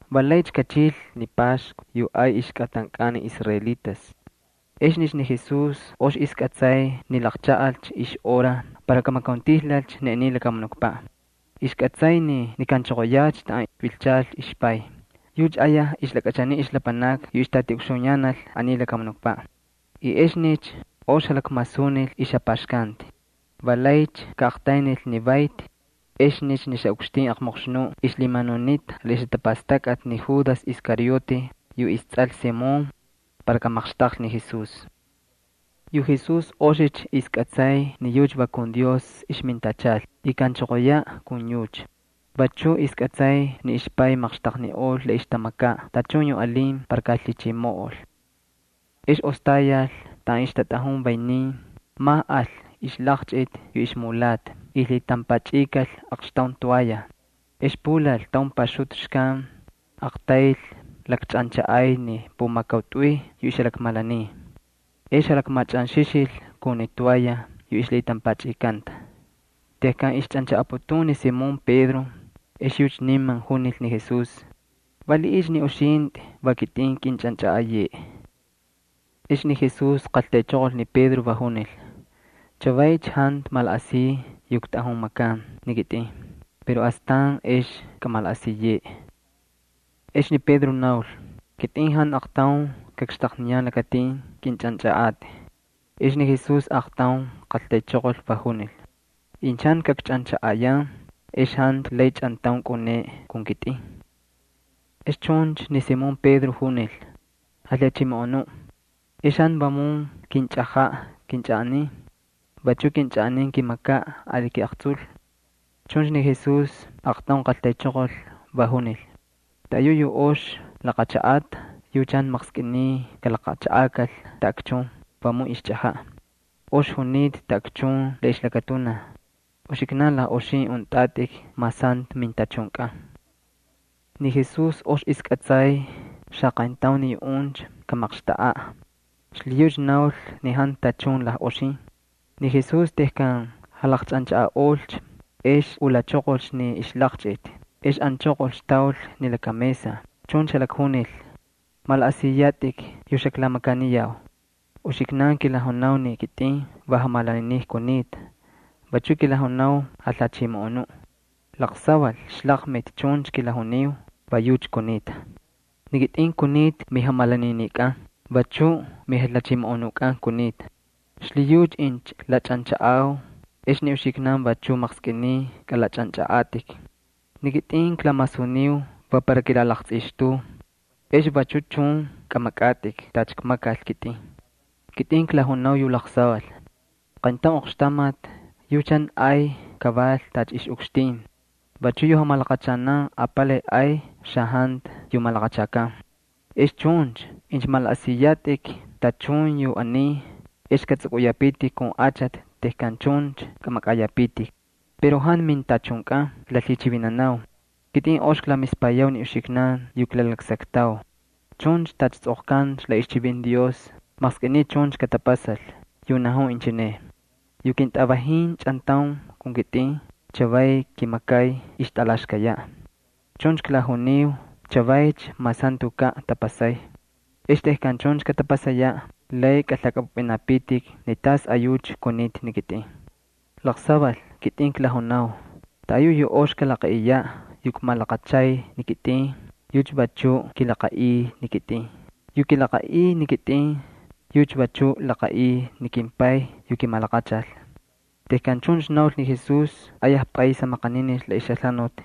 Va laycha kachil ni Paxku yu ay ixkꞌatankꞌan ni israelitas. Exnicha ni Jesús ox ixkꞌatsay ni laqchaꞌalcha ixhora para kamakauntijlalcha ni aniy lakamunukpaꞌ. Ixkꞌatsay ni kaꞌanchoqoyacha taꞌan vilchal ixPay. Yucha ayaj ixlakꞌachaniy ixlapanakni yu ixtꞌatiꞌukxuyanal aniy lakamunukpaꞌ, jantu aqtaun kamiꞌol ixjapaxkanti. Va laycha kaꞌaqtaynil ni vayti. Exnicha ni xaꞌukxtin aqmoqxnuꞌ ixlhimanunita la ixjatapastakꞌati ni Judas Iscariote yu istsꞌal Simón para kamaqxtaqlhi ni Jesús. Yu Jesús oxicha ixkꞌatsay ni yucha va kun Dios ixmintachal, y kaꞌanchoqoyaꞌ kun yucha. Vachuꞌ ixkꞌatsay ni ixPay maqxtaqniꞌol la ixtamakaꞌ tachun yu alin para kalhichimoꞌol. Ex ostayal taꞌan ixtatꞌajun vaynin, majꞌal ixlaqchꞌiti yu ixmulata y lhitampachꞌikal aqxtaun toalla. Ex pulal taun paxutu xkan aqtayl lakchꞌanchaꞌay ni pumakautꞌuy yu ixjalakmalaniy. Ex jalakmachꞌanxixil kun ni toalla yu ixlhitampachꞌikanta. Tejkan ixchꞌanchaꞌaputun ni Simón Pedro ex yucha niman junil ni Jesús: —¿Valiꞌiycha ni uxintꞌi va kitꞌin kꞌinchꞌanchꞌaꞌayeꞌe? Ex ni Jesús qaltaychoqol ni Pedro, va junil: —Chavaycha jantu malaꞌasiy yu ktꞌajun makan ni kitꞌin, pero astan ex kꞌamalaꞌasiyeꞌe. Ex ni Pedro naul: —Kitꞌin jantu aqtaun kakxtaqniyan lakatin kꞌinchꞌanchꞌaꞌatꞌi. Ex ni Jesús aaqtaun qaltaychoqol, va junil: —Incha jantu kakchꞌanchaꞌayan ex jantu lay chꞌantaun kꞌaꞌuneꞌe kun kitꞌin. Ex chuncha ni Simón Pedro junil: —Jalhachimoꞌonuꞌ, ex jantu vamun kinchꞌajaꞌ kꞌinchꞌaꞌanin. Vachuꞌ kꞌinchꞌaꞌanin kimakaꞌ ali kiꞌaqtsul. Chuncha ni Jesús aaqtaun qaltaychoqol, va junil: —Taꞌayuꞌ yu ox laqachaꞌata yucha jantu maqskꞌiniy kalaqachaꞌakal taꞌakchun, vamun ixchꞌajaꞌ. Ox junita taꞌakchun la ixlakatunaj. Uxiknan lajꞌoxin untꞌatꞌik mas jantu mintachunkꞌan. Ni Jesús ox ixkꞌatsay xaqayntaun ni yuꞌuncha kamaqxtaꞌaꞌ, xlhiyucha naul ni jantu tachun lajꞌoxin. Ni Jesús tejkan jalaqchꞌanchaꞌaꞌolcha ex ulachoqolcha ni ixlaqchꞌiti ex anchoqolcha taul ni laka mesa, chuncha jalakjunil: —¿Malaꞌasiyatꞌik yu xaklamakaniyau? Uxiknan kilajunau ni kitꞌin va jamalaniniꞌ kunita, vachuꞌ kilajunau jalhachimoꞌonuꞌ. Laqsaval ixlaqmiti chuncha kilajuniu, va yucha kunita. Ni kitꞌin kunita miJamalaninikꞌan, vachuꞌ miJalhachimoꞌonukꞌan kunita. Xlhiyucha incha klachꞌanchaꞌau ex ni uxiknan vachuꞌ maqskꞌiniy kꞌalachꞌanchꞌaꞌatꞌik. Ni kitꞌin klamasuniu va para kilalaqtsꞌixtuu. Ex vachu chun kꞌamakꞌatꞌik tacha kmakal kitꞌin. Ni kitꞌin klajunau yu laqsaval. Qayntaun oqxtamati yucha jantu ay kaval tacha ixꞌukxtin. Vachuꞌ yu jamalaqachanan apalay ay xajantu yu malaqachakan. Ex chuncha incha malaꞌasiyatꞌik tachun yu aniy, ex katsꞌukꞌuyapitik kun achati tejkan chuncha kꞌamakꞌayapitik. Pero jantu mintachunkꞌan klalhichivinau. Kitꞌin ox klamispayau ni uxiknan yu klalaksaktau. Chuncha tacha tsꞌoqkanta la ixchivinti Dios maqskꞌiniy chuncha katapasal, yu najun inchineꞌ: “Yu kintꞌavajin chꞌantaun kun kitꞌin chavay kimakay ixtꞌalaxkayaꞌ.” Chuncha klajuniu chavaycha mas jantukaꞌ tapasay. Ex tejkan chuncha katapasayaꞌ lay kalhakꞌapꞌupꞌinapitik ni tasꞌayucha kunita ni kitꞌin. Laqsaval kitꞌin klajunau, taꞌayuꞌ yu ox kalaqaꞌiyaꞌ yu kmalaqachay ni kitꞌin, yucha vachu kilaqaꞌiy ni kitꞌin. Yu kilaqaꞌiy ni kitꞌin, yucha vachuꞌ laqaꞌiy ni kimPay yu kimalaqachal. Tejkan chuncha naul ni Jesús ayaj pꞌays jamaqaninil la ixjalhanuti.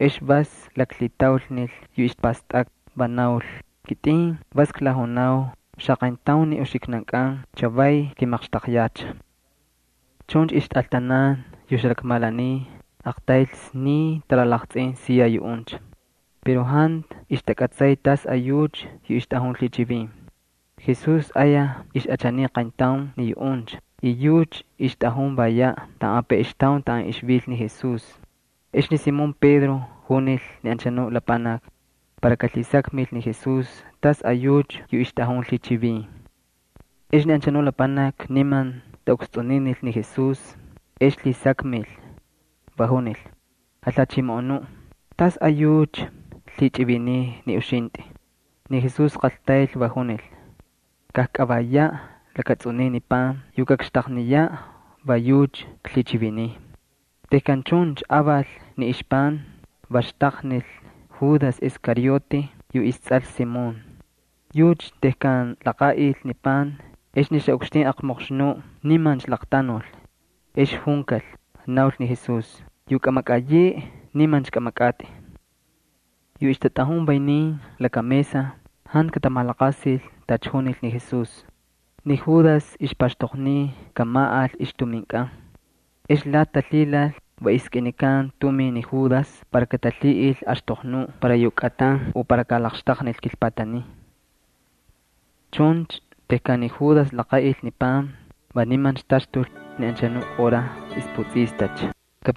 Ex vas laklhitaulnil yu ixpastakꞌa, va naul: —Kitꞌin vas klajunau, xaqayntaun ni uxiknankꞌan chavay kimaqxtaqyacha. Chuncha ixtꞌaltanan yu ixjalakmalaniy aqtayl sniy talalaqtsꞌin siya yuꞌuncha, pero jantu ixtakꞌatsay tasꞌayucha yu ixtꞌajun lhichivin. Ni Jesús ayaj ixꞌachaniy qayntaun ni yuꞌuncha y yucha ixtꞌajun vayaꞌ taꞌan apeꞌextaun taꞌan ixvil ni Jesús. Ex ni Simón Pedro majkunil ni anchanu lapanaki para kalhisakmil ni Jesús tasꞌayucha yu ixtꞌajun lhichivin. Ex ni anchanuꞌ lapanaki niman taꞌukstsꞌuninil ni Jesús ex lhisakmil, va junil: —Jalhachimoꞌonuꞌ, ¿tasꞌayucha lhichꞌiviniy ni uxintꞌi? Ni Jesús qaltayl, va junil: —Kajkꞌavayaꞌ lakatsꞌuniy ni pan. Yu kakxtaqniyaꞌ, va yucha klhichiviniy. Tejkan chuncha aval ni ixpan, va xtaqnil ni Judas Iscariote yu istsꞌal Simón. Tejkan laqaꞌil ni pan ni Judas, ex ni Satanás nimancha laqtanul. Ex junkal, naul ni Jesús: —Yu kꞌamakꞌayeꞌe, nimancha kꞌamakꞌatꞌi. Yu ixtatꞌajun vaynin laka mesa jantu katamalaqasil tacha junil ni Jesús. Ni Judas ixpaxtoqniy kamaꞌal ixtuminkꞌan. Ex lati talhilal va iskꞌinikan tumin ni Judas para katalhiꞌil axtoqnuꞌ para yu kꞌatan o para kalaqxtaqnil kilpatanin. Chuncha tejkan ni Judas laqaꞌil ni pan va nimancha taxtul. Ni anchanuꞌ hora ixputsꞌistacha.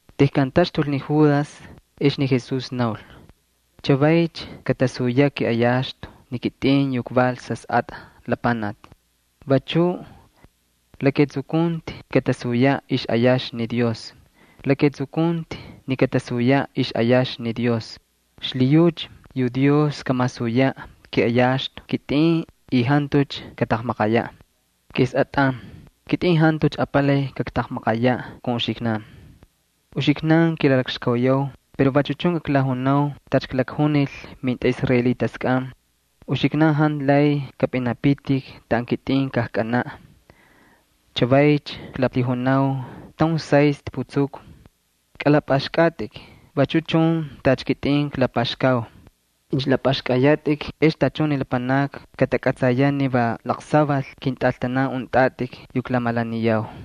Tejkan taxtul ni Judas ex ni Jesús naul: —Chavaycha katasuyaꞌ kiꞌayaxtu ni kitꞌin yu kval Sasꞌatꞌa Lapanaki, vachuꞌ la ketsukunti katasuyaꞌ ixꞌayaxtu ni Dios. La ketsukunti ni katasuyaꞌ ixꞌayaxtu ni Dios, xlhiyucha yu Dios kamasuyaꞌ kiꞌayaxtu kitꞌin y jantucha kataqmaqayaꞌ. Kesꞌatꞌan, kitꞌin jantucha apalay kaktaqmaqayaꞌ kun uxiknan. Uxiknan kilalakxkauyau pero vachu chun klajunau tacha klakjunil mintꞌaꞌisraelitaskꞌan: uxiknan jantu lay kapꞌinapitik taꞌan kitꞌin kajkꞌanaꞌ. Chavaycha klalhijunau taun saystꞌi putsuku. Kꞌalapꞌaxkꞌatꞌik vachu chun tacha kitꞌin klapaxkau. Incha lapꞌaxkꞌayatꞌik ex tachun ni lapanakni katakꞌatsayaꞌ ni va laqsaval kintꞌaltanan untꞌatꞌik yu klamalaniyau.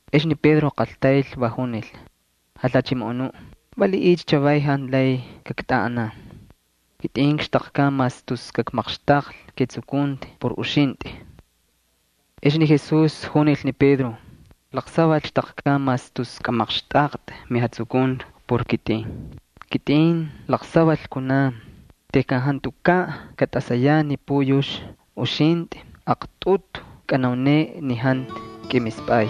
Ex ni Pedro qaltayl, va junil: —Jalhachimoꞌonuꞌ, ¿valiꞌiycha chavay jantu lay kaktꞌaꞌanan? Kitꞌin kxtaqkan mas tus kakmaqxtaqlhi ketsukunti por uxintꞌi. Ex ni Jesús junil ni Pedro: —¿Laqsaval xtꞌaqkꞌan mas tus kꞌamaqxtꞌaqtꞌi metsukunti por kitꞌin? Kitꞌin laqsaval kunan tejkan jantukaꞌ tꞌasay ni puyux uxintꞌi aqtꞌutu kꞌanauneꞌe ni jantu kꞌimispꞌay.